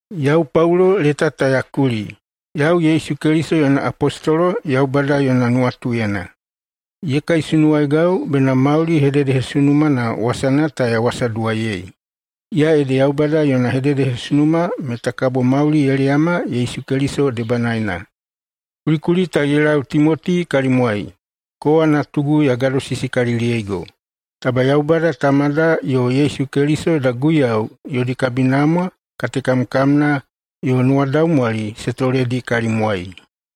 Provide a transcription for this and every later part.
Yau Paulo leta ta ya kuli. Yau Yesu Keliso yona apostolo Yaubada yona nuwatuyena. Ye kaisunuwaigau bena mauli hededehesunumana wasana ta ya wasaduwaiyei. Iya ede Yaubada yona hededehesunuma meta kabo mauli ye leyama Yesu Keliso debanaena. Kulikuli ta ye lau Timoti kalimwai, kowa natugu ya gadosisikaliliyeigo. Taba Yaubada Tamada yo Yesu Keliso yoda Guiyau yodi kabinamwa, katekamkamna, yo nuwadaumwali se toledi kalimwai.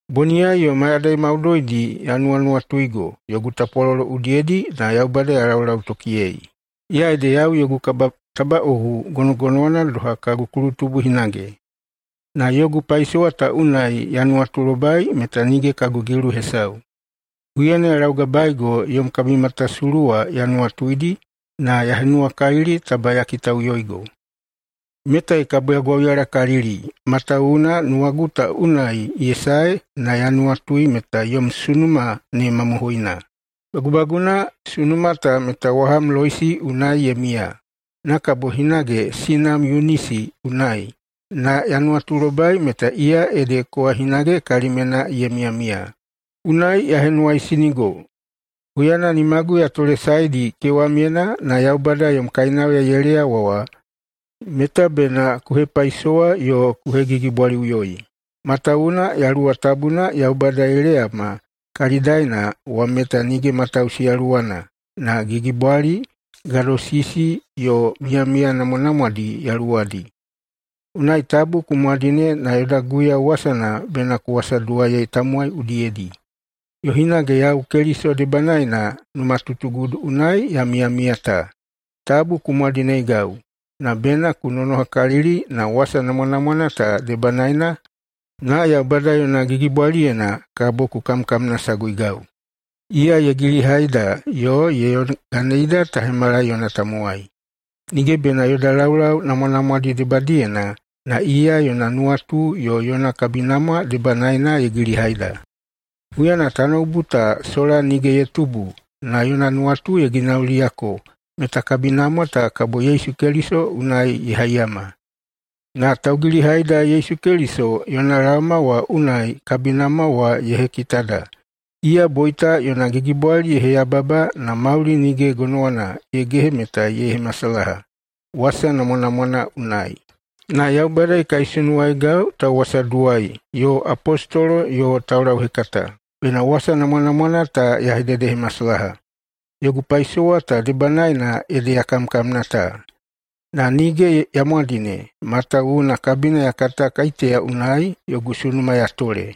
Boniyai yo mayadai maudoidi ya nuwanuwatuigo yogu tapwalolo udiyedi na Yaubada ya laulautokiyei. Iya ede yau yogu kabatabaꞌohu gonogonowana doha kagu kulutubu hinage, na yogu paisowa ta unai ya nuwatulobai meta nige kagu gilu hesau. Huyana ya laugabaeigo yom kabimatasulu wa ya nuwatuidi na ya henuwakalili taba ya kitaꞌuyoigo. Metai kabo ya gwauyalakalili, matawuwuna nuwagu ta unai ye sae na ya nuwatui meta yom sunuma ne mamohoina. Bagubaguna, sunuma ta meta waham Loisi unai ye miya, na kabo hinage sinam Yunisi unai, na ya nuwatulobai meta iya ede kowa hinage kalimyena ye miyamiya. Unai ya henuwaisinigo: Huyana nimagu ya tolesaedi kewamyena na Yaubada yom kainauya ye leyawa wa meta bena ku hepaisowa yo ku hegigibwaliꞌuyoi. Matawuwuna Yaluwa Tabuna Yaubada ye leyama kalidaena wa meta nige matausi Yaluwana, na gigibwali, gadosisi yo miyamiya namwanamwadi yaluwadi. Unai tabu ku mwadine na yoda Guiyau wasana bena ku wasaduwaiyei tamowai udiyedi. Yo hinage yau Keliso debanaena numatutugudu unai ya miyamiya ta, tabu ku mwadineigau, na bena ku nonohakalili na wasa namwanamwana ta debanaena na Yaubada yona gigibwaliyena kabo ku kamkamnasaguigau. Iya ye gilihaida yo ye yoganeida ta hemala yona tamowai. Nige bena yoda laulau namwanamwadi debadiyena, na iya yona nuwatu yo yona kabinamwa debanaena ye gilihaida. Huyana tanoubu ta sola nige ye tubu na yona nuwatu ye ginauliyako meta kabinamwa ta kabo Yesu Keliso unai ye haiyama. Na taugilihaida Yesu Keliso yona laoma wa unai kabinamwa wa ye hekitada. Iya boita yona gigibwali ye heyababa na mauli nige gonowana ye gehe meta ye hemasalaha wasa namwanamwana unai. Na Yaubada ye kaisunuwaigau tauwasaduwai yo apostolo yo taulauhekata, bena wasa namwanamwana ta ya hededehemasalaha. Yogu paisowa ta debanaena ede ya kamkamna ta. Na nige ya mwadine, matawuwuna kabina ya kata kaiteya unai yogu sunuma ya tole,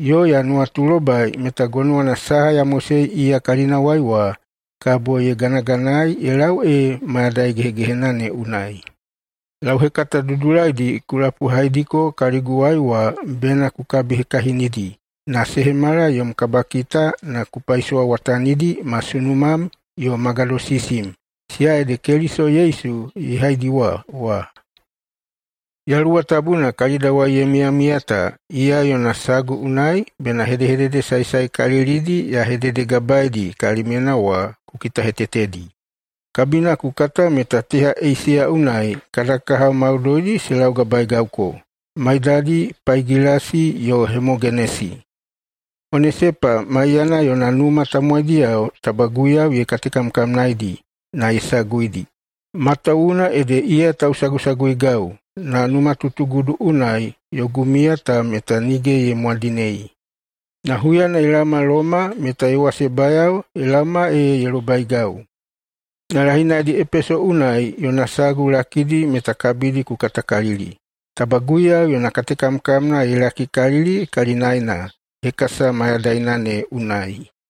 yo ya nuwatulobai meta gonowana saha ya mosei iya kalinawai wa kabo ye ganaganaei ye lau ee mayadai gehegehena ne unai. Lauhekata dudulaidi ku lapuhaidiko kaliguwai wa bena ku kabihekahinidi na se hemala yom kabakita na ku paisowawatanidi ma sunumam yo ma gadosisim, siya ede Keliso Yesu ye haidiwa wa. Yaluwa Tabuna kalidawai ye miyamiya ta, iya yona sagu unai bena hedehedede saesaekalilidi ya hededegabaeidi kalimyena wa ku kitahetetedi. Kabina ku kata meta teha Eisiya unai kada kahao maudoidi se laugabaegauko, maidadi Paigilasi yo Hemogenesi. Onesepa maiyana yona numa tamowaidiyao taba Guiyau ye katekamkamnaeidi na ye saguidi, matawuwuna ede iya tausagusaguigau na numatutugudu unai yogu miya ta meta nige ye mwadinei na huyana ye laoma Loma meta ye wasebayao ye laoma ee ye lobaigau. Na [lahinaidi] Epeso unai yona sagu lakidi meta kabidi ku katakalili. Taba Guiyau yona katekamkamna ye lakikalili kalinaena hekasa mayadaina ne unai.